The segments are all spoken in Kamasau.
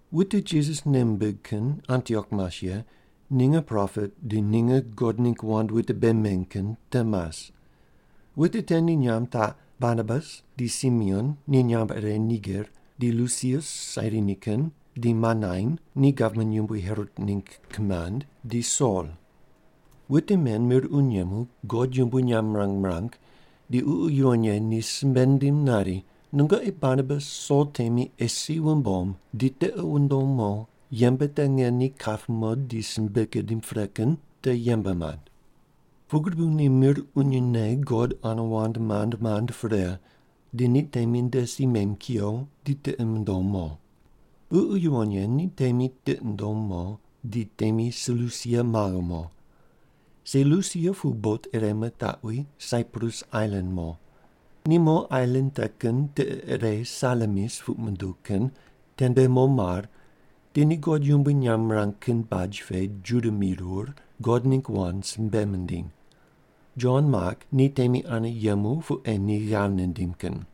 Wute Jisas nei mimbig kin Antiok mas ye ninge propet di ninge God ningg wand wute bei meny kin te mas. Wute te ni nyamb taq: Barnabas, di Simeon ni nyamb ire Niger, di Lusius Sairini kin, di Manain, ni gavman yumbui Herot ningg kimand, di Sol. Wute men mir uny yemu God yumbui nyamb mirang mirang, di Ququ Yuwon Ye ni simbe nindim nari, “Nungoqi Barnabas Sol temi ei si wumbom di tiqi wundom mo yembe te nge ni kap mo di simbe gidim pre kin te yembe mand.” Pugri bu ni mir unyne God ane wand mand mand pre, di ni temi nde si mem kuyo, di tiqi mundom mo. Ququ Yuwon Ye ni temi tiqi nundom mo, di temi Selusia maghe mo. Selusia pu bot ire mitaqwi Saiprus ailan mo. Ni mo ailan te kin tiqe ire Salamis puq munduw kin tende mo mar, di ni God yumbui nyamb mirang kin baj pe Juda mirur, God ningg wand simbe mindiny. Jon Mak ni temi ane yemu pu ei ni ghav nindim kin.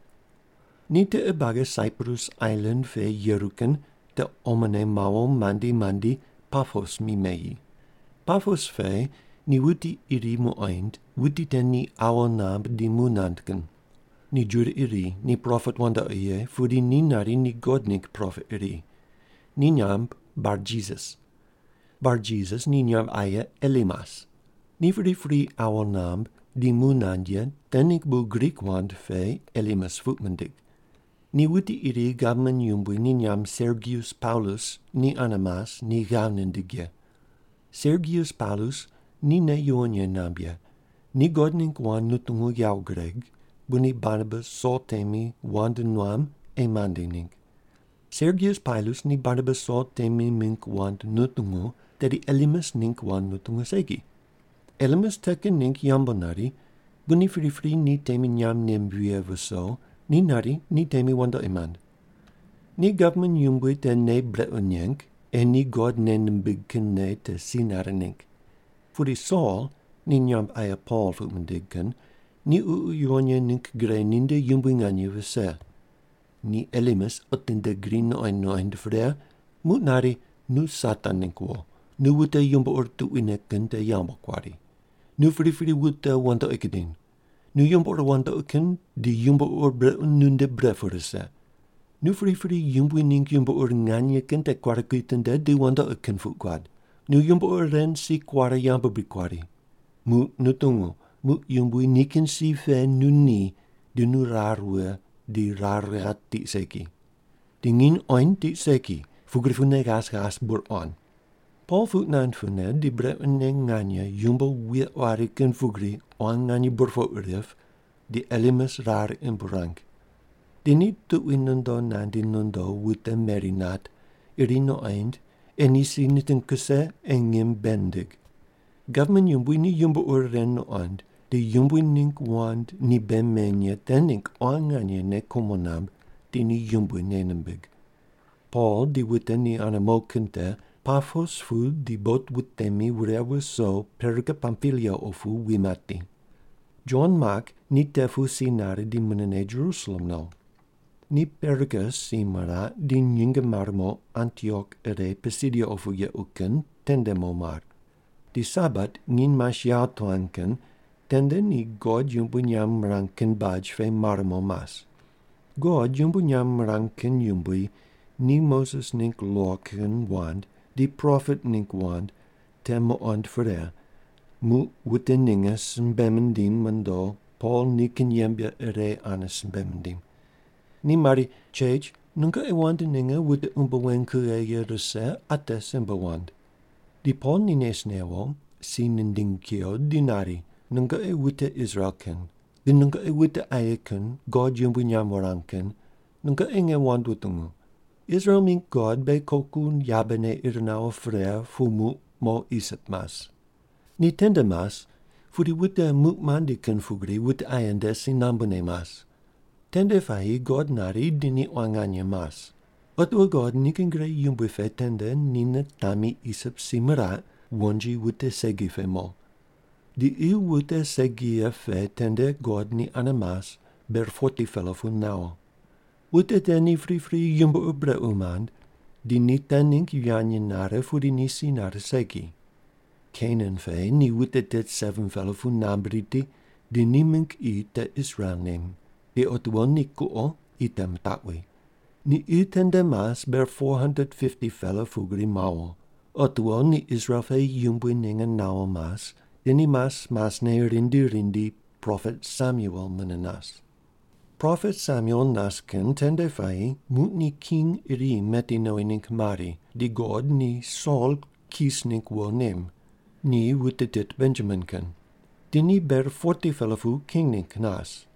Ni tiqe buagi Saiprus ailan pe yeru kin te omone mawo mandi mandi Papos mi meyi. Papos pe ni wuti iri muqoind, wuti te ni awo namb di mu nand kin. Ni Juda iri ni propet wandoqi ye pudi ni nari ni God ningg propet iri. Ni nyamb Barjisas. Barjisas ni nyamb aye Elimas. Ni pripri awo namb di mu nand ye te ningg bu Grik wand pe Elimas puq mindig. Ni wuti iri gavman yumbui ni nyamb Sergius Paulus ni ane mas ni ghav nindig ye. Sergius Paulus ni nei yuwon ye namb ye, ni God ningg wand nutungu yawo gureg, bu ni Barnabas Sol temi wand nuam ei mandi ningg. Sergius Paulus ni Barnabas Sol temi mingg wand nutungu, tedi Elimas ningg wand nutungu segi. Elimas te kin ningg yambu nari, bu ni pripri ni temi nyamb nem vighe viso, ni nari ni temi wandoqi mand. Ni gavman yumbui te nei brequ neng, ei ni God nei nimbig kin nei te si nare ningg. Pudi Sol, ni nyamb aye Pol puq mindig kin, ni Ququ Yuwon Ye ningg gre ninde yumbui nganye vise. Ni Elimas otinde gri nuqoind nuqoind pre muq nari, “Nu Satan ningg wo! Nu wute yumbo ur tuquine kin te yambu kuari! Nu pripri wute wandoqi gudiny! Nu yumbo ur wandoqi kin di yumbo ur brequ nunde bre pu rise! Nu pripri Yumbui ningg yumbo ur nganye kin te kuare kuitinde di wandoqi kin puq guad! Nu yumbo ur ren si kuare yambu bri kuari? Muq nu tungu! Muq Yumbui nikin si pe nu ni, di nu rar wughe, di rar ghat tiq segi. Di nginy qoind tiq segi, pugri pune ghas ghas bur quan.” Pol puq nand pune di brequne nganye yumbo wuye quari kin pugri quan nganye burpoq rip di Elimas rar imb ruang. Di ni tuqui nondo nandi nondo wute meri nat, iri nuqoind ei ni si niting kuse ei ngim bei nindig. Gavman yumbui ni yumbo ur ren nuqond, di Yumbui ningg wand ni bei meny ye te ningg quan nganye nei kumo namb, di ni Yumbui nei nimbig. Pol di wute ni ane mo kin te Papos pu di bot wutemi wure wuso Perga Pampilia opu wi mati. Jon Mak ni te pu si nare di munene Jerusalem no. Ni Perga si miraq, di nyinge mare mo Antiok ire Pisidia opu yequ kin tende mo mar. Di Sabat nginy mas yawo tuan kin tende ni God yumbui nyamb mirang kin baj pe mar mo mas. God yumbui nyamb mirang kin yumbui ni Moses ningg lo kin wand di propet ningg wand te muqond pre, muq wute ninge simbe mindim mondo Pol nikin yembe ire ane simbe mindim. Ni mari, “Chech, nungoqi wand ninge wute umbo weny kughe ye rise ate simbe wand.” Di Pol ni nes newo, si nindingi kuyo, di nari, “Nungoqi wute Israel kin, di nungoqi wute aye kin God yumbui nyamb wurang kin, nungoqi nge wand wutungu. Israel mingg God beghi koku yabene ir nawo pre pu muq mo Isip mas. Ni tende mas pudi wute muq mandi kin pugri wute aye nde si nambune mas. Tende puayi God nari di ni quan nganye mas. Otiwo God nikin gre yumbui pe tende ni nitami Isip si miraq, wonji wute segi pe mo. Di qi wute segi ye pe tende God ni ane mas ber 40-pela pu mawo. Wute te ni pripri yumbo ur brequ mand, di ni te ningg yivany nare, pudi ni si nare segi. Kenan pe ni wute tit 7-pela pu namb riti, di ni mingg qi te Israel nem, di otiwo ni kuqo qi te mitaqwi. Ni qi tende mas ber 450-pela pugri mawo. Otiwo ni Israel pe yumbui ninge nawo mas, di ni mas masne rindi rindi propet Samuel mune nas. “Propet Samuel nas kin tende puayi muq ni king iri meti nowi ningg mari, di God ni Sol Kis ningg wo nem. Ni wute tit Benjamin kin. Di ni ber 40-pela pu king ningg nas.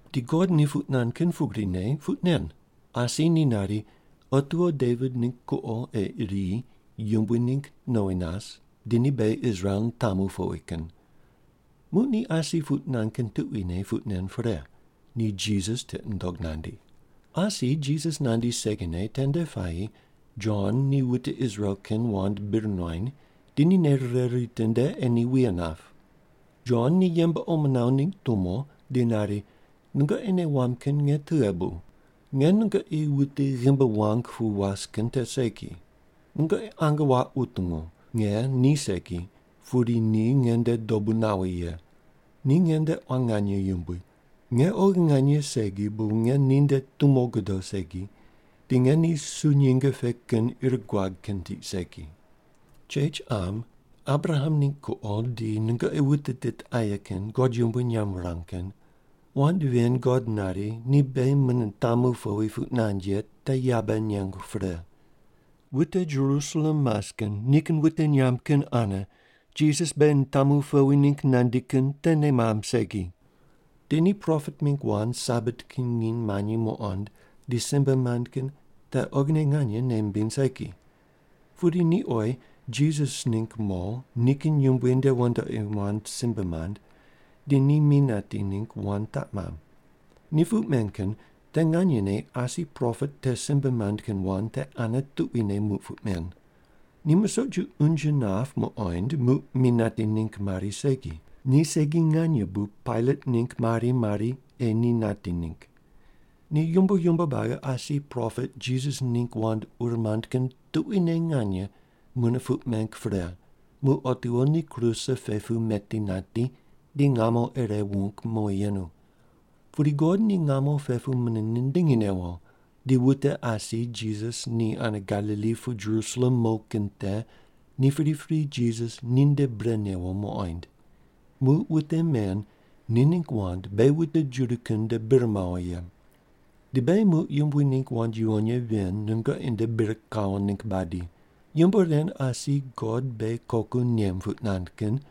Di God ni puq nand kin pugrine puq nen. Asi ni nari, otiwo Devit ningg kuqo ei iri yumbui ningg nowi nas di ni beghi Israel nitamu powi kin. Muq ni asi puq nand kin tuquine puq nen pre, ni Jisas tiqi nundog nandi. “Asi Jisas nandi segine tende puayi Jon ni wute Israel kin wand bir nuany, di ni nei rire ritinde ei ni wuye nap. Jon ni yembe omo nawo ningg tumo di nari, ‘Nungoqi nei wamb kin nge tughe bu? Nge nungoqi wuti ghimbi wuang pu was kin te segi. Nungoqi ange wuaq wutungu! Nge ni segi, pudi ni nge nde dobu nawi ye. Ni nge nde quan nganye yumbui. Nge oghi nganye segi bu nge ninde tumo godo segi, di nge ni su nyinge pe kin ir guag kin tiq segi.’ “Chech qam, Abraham ningg kuqo di nungoqi wute tit aye kin God yumbui nyamb wurang kin, wand ven God nari ni beghi mune nitamu powi puq nand ye te yabe nengu pre. Wute Jerusalem mas kin nikin wute nyamb kin ane Jisas beghi nitamu powi ningg nandi kin te nei mamb segi. Di ni propet mingg wand Sabat kin nginy manyi muqond di simbe mand kin te oghine nganye nei mimbiny segi. Pudi ni oyi Jisas ningg mo nikin yumbui nde wandoqi wand simbe mand, di ni mi nati ningg wand taq mamb. Ni puq men kin te nganyene asi propet te simbe mand kin wand te ane tuquine muq puq men. Ni musoq ju unje nap muqoind muq mi nati ningg mari segi, ni segi nganye bu Pailat ningg mari mari ei ni nati ningg. Ni yumbo yumbo buagi asi propet Jisas ningg wand ur mand kin tuquine nganye mune puq meng pre muq otiwo ni kruse pe pu meti nati, di ngamo ire wung mowi yenu. Pudi God ni ngamo pe pu mune nindingi newo. Di wute asi Jisas ni ane Galili pu Jerusalem mo kin te ni pripri Jisas ninde bre newo muqoind. Muq wute men ni ningg wand beghi wute Juda kin nde bir mawo ye. “Di beghi muq Yumbui ningg wand yuwon ye ven nungoqi nde bir kawo ningg badi: Yumbo ren asi God beghi koku nem puq nand kin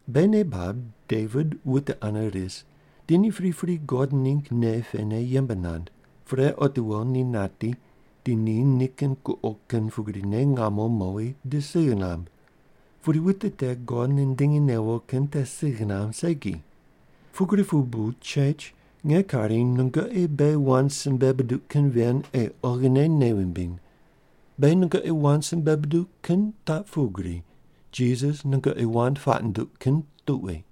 “Beghi nei bab Devit wute ane ris, di ni pripri God ningg nei pene yembe nand. Pre otiwo ni nati, di ni nikin kuqo kin pugrine ngamo mowi di sigh namb. Pudi wuti te God nindingi newo kin te sigh namb segi. Pugri pu bu chech nge kari nungoqi beghi wand simbe buduq kin ven ei oghine nei wumbiny. Beghi nungoqi wand simbe buduq kin taq pugri: Jisas nungoqi wand puaq nunduq kin tuqui.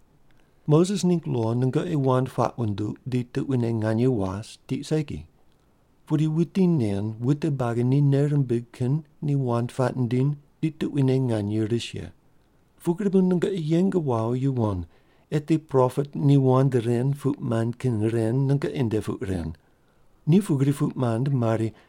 Moses ningg lo nungoqi wand puaq wunduq di tuquine nganye was tiq segi. Pudi wuti nen wute buagi ni nei rimbig kin ni wand puaq nindiny di tuquine nganye ris ye. Pugri bu nungoqi yeng wawo yuwon eti propet ni wand ren puq mand kin ren nungoqi nde puq ren. Ni pugri puq mand mari,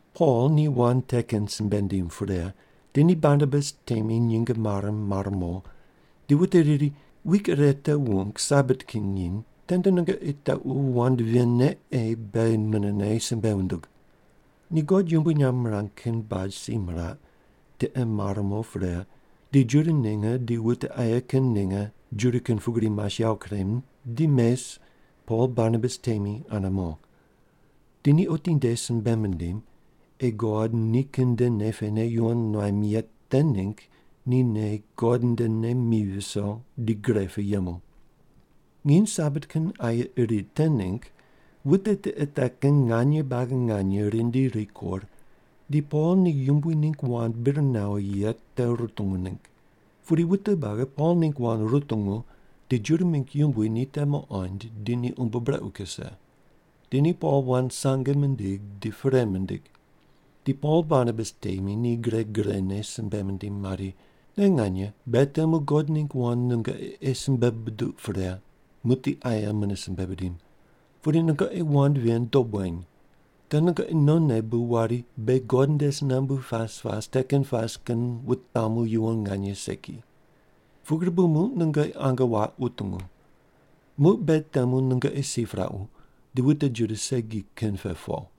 Pol ni wand te kin simbe nindim pre, di ni Barnabas temi nyinge mare mar mo, di wute riri, “Wik ire te wung Sabat kin nginy tende nungoqi tequ wand ven ne ei beghi munene simbe wundug.” Ni God yumbui nyamb mirang kin baj si miraq, tiqe mar mo pre, di Juda ninge di wute aye kin ninge Juda kin pugri mas yawo kurem di mes, Pol Barnabas temi ane mo. Di ni otinde simbe mindim ei God nikin nde nei pene yuwon nuam ye te ningg ni nei God ndene mi viso di gre pu yemu. Nginy Sabat kin aye iri te ningg wute tiqe te kin nganye buagi nganye rindi rikur, di Pol ni Yumbui ningg wand bir nawo ye te rutungu ningg. Pudi wute buagi Pol ningg wand rutungu, di Juda mingg yumbui ni te muqond, di ni umbo brequ kuse. Di ni Pol wand sange mindig di perei mindig. Di Pol Barnabas temi ni gre grene simbe mindim mari, “Te nganye, beghi temu God ningg wand nungoqi ei simbe buduq pre, muqdi aye mune simbe bidim. Pudi nungoqi wand ven dob weny. Te nungoqi nonne bu wari, ‘Beghi God nde si nambu pas pas te kin pas kin wutamu yuwon nganye segi.’ Pugri bu muq nungoqi ange wuaq wutungu. Muq beghi temu nungoqi si piraqu, di wute Juda segi kin pe po.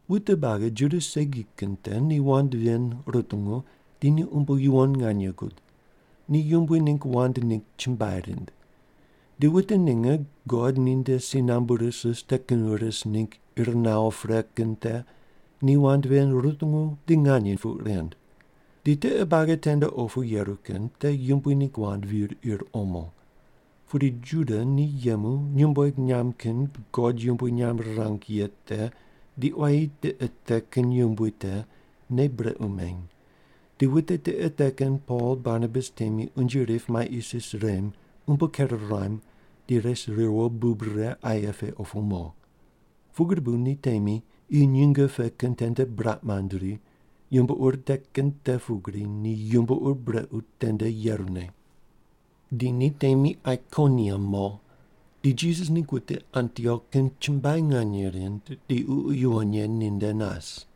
Wute buagi Juda segi kin te ni wand ven rutungu, di ni umbo yuwon nganye gud. Ni Yumbui ningg wand ningg chumbuai rind. Di wute ninge God ninde si nambu ris ris te kin ris ningg ir nawo pre kin te ni wand ven rutungu di nganye puq rind. Di tiqe buagi tende opu yeru kin te Yumbui ningg wand vir ir omo. Pudi Juda ni yemu nyumbueg nyamb kin God yumbui nyamb rirang ye te di quayi tiqe te kin yumbui te nei brequ meny, di wute tiqe te kin Pol Barnabas temi unje rip mai isis rem, umbo ker ruam, di res riwo bub rire aye pe opu mo. Pugri bu ni temi qi nyinge pe kin tende buraq mand ri, yumbo ur te kin te pugri ni yumbo ur brequ tende yerune. Di ni temi Aikoniam mo. Di Jisas ningg wute Antiok kin chumbuai nganye rind, di Ququ Yuwon Ye ninde nas.